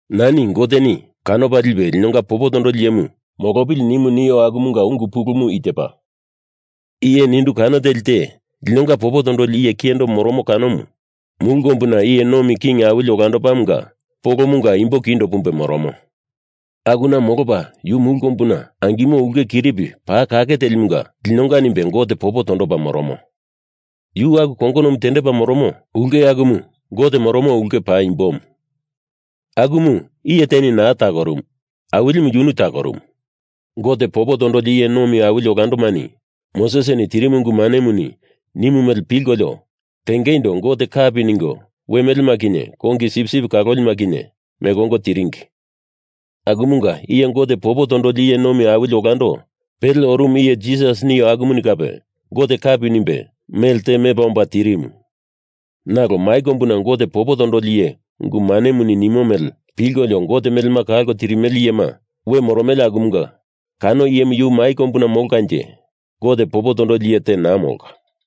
Nani Goteni kanopa lipe linonga popo tondoli iyemu molopili nimu nio akumunga ungu pulumu i tepa, iye nindu kano teli te linonga popo tondoli iye kiyendo moromo kanomu mulu kombuna Iye Nomi King Awili Olandomunga polomunga imbo kindo pumbe moromo. Akuna molopa yu mulu kombuna angimo ulkemunga kiripi paa kake telimunga linonga nimbe Gote popo tondopa moromo. Yu aku kongonomu tendepa moromo ulke akumu Gote moromo ulke paimbomu. Akumu iye teni naa takorumu, Awilimu yunu takorumu. Gote popo tondoli iye nomi awili olandomani Mosesini tirimu ungu manemuni nimu mele pilkolio tengeindo Gote kapi ningo we melema kinye kongi sipsip kalolima kinye meko ongo tiringi, akumunga iye Gote popo tondoli iye nomi awili olando pele orumu iye Jisas nio akumuni kape Gote kapi nimbe mele te mepa omba tirimu. Nalo mai kombuna Gote popo tondoli iye ungu manemuni nimo mele pilkolio Gote melema kalko tirimele iyema we moromele akumunga kano iyemu yu mai kombuna molkanje Gote popo tondoli iye te naa molka.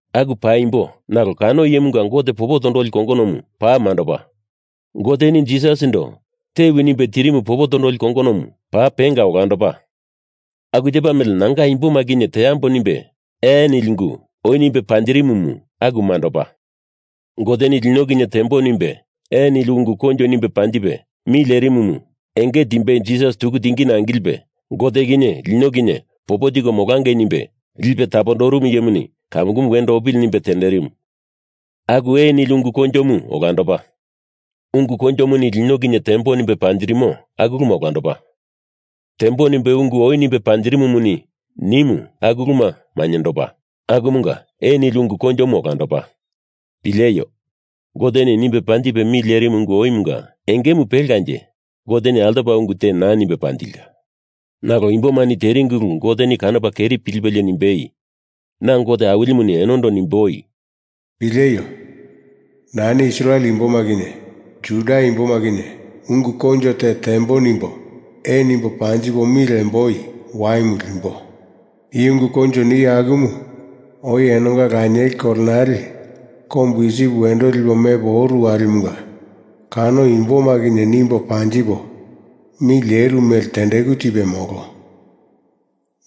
Aku paimbo, nalo kano iyemanga Gote popo tondoli kongonomu paa mandopa. Goteni Jisasindo tewi nimbe tirimu popo tondoli kongonomu paa penga olandopa. Aku tepa mele nanga imboma kinye tembo nimbe ee nili ungu oi nimbe panjirimumu aku mandopa. Goteni lino kinye tembo nimbe ee nili ungu koinjo nimbe panjipe mi lerimumu enge timbei Jisas tuku tingina angilipe Gote kinye lino kinye popo tiko molangei nimbe lipe tapondoromo iyemuni kamukumu wendo opili nimbe tenderimu, aku ee nili ungu koinjomu olandopa. Ungu koinjomuni lino kinye tembo nimbe panjirimo aku uluma olandopa, tembo nimbe ungu oi nimbe panjirimumuni nimu aku uluma mainyendopa, akumunga ee nili ungu koinjomu olandopa. Pileio! Goteni nimbe panjipe mi lierimu ungu oimunga engemu pelkanje Goteni altopa ungu te naa nimbe panjilka. Nalo imbomani teringi ulu Goteni kanopa keri pilipelie nimbei, Na Gote Awilimuni enondo nimboi, “Pileio! Nani Israel imboma kinye Juda imboma kinye ungu koinjo te tembo nimbo ee nimbo panjipo mi lemboi waimu limbo. I ungu koinjo nio akumu oi enonga lanieli kolenale kombu Isip wendo lipo mepo oru walimunga kano imboma kinye nimbo panjipo mi leru mele tendeku tipe molo.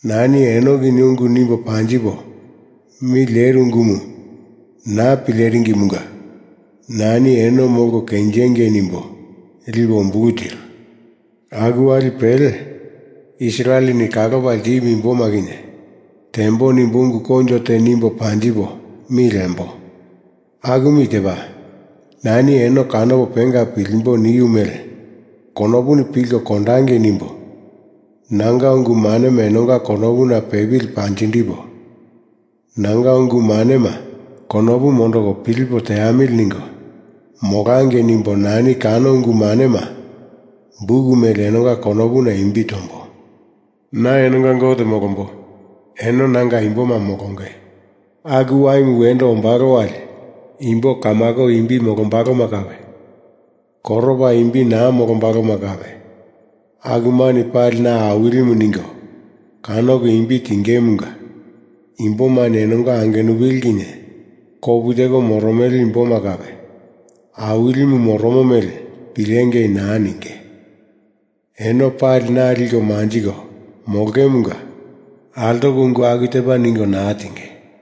Nani eno kinye ungu nimbo panjipo mi leru ungumu naa pileringimunga nani eno molko kenjingei nimbo lipo umbulu tiru. Aku wali pele, Israeleni kalopa ltimu imboma kinye tembo nimbo ungu koinjo te nimbo panjipo mi lembo, akumu i tepa, Nani eno kanopo penga pilimbo niu mele konopuni pilko kondangei nimbo nanga ungu manema enonga konopuna pepili panjindipo, nanga ungu manema konopu mondoko pilipo teamili ningo molangei nimbo nani kano ungu manema buk mele enonga konopuna imbi tombo. Na enonga Gote molombo. Eno nanga imboma molonge. Aku waimu wendo ombalo wali imbo kamako imbi molombaloma kape, koropa imbi naa molombaloma kape, akumani pali na Awilimu ningo kanoko imbi tingemunga imbomani enonga angenupili kinye kopu teko moromele imboma kape Awilimu moromo mele pilengei naa ninge. Eno pali na liko manjiko molongemunga altoko ungu aku tepa ningo naa tinge.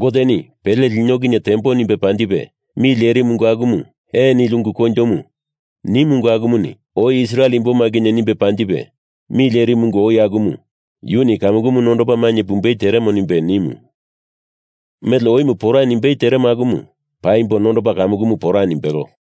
Goteni pele lino kinye tembo nimbe panjipe mi lerimu ungu akumu ee nili ungu koinjomu nimu ungu akumuni oi Israel imboma kinye nimbe panjipe mi lerimu ungu oi akumu yuni kamukumu nondopa mainye pumbei teremo nimbe nimu. Mele oimu pora nimbei teremo akumu paimbo nondopa kamukumu pora nimbelo.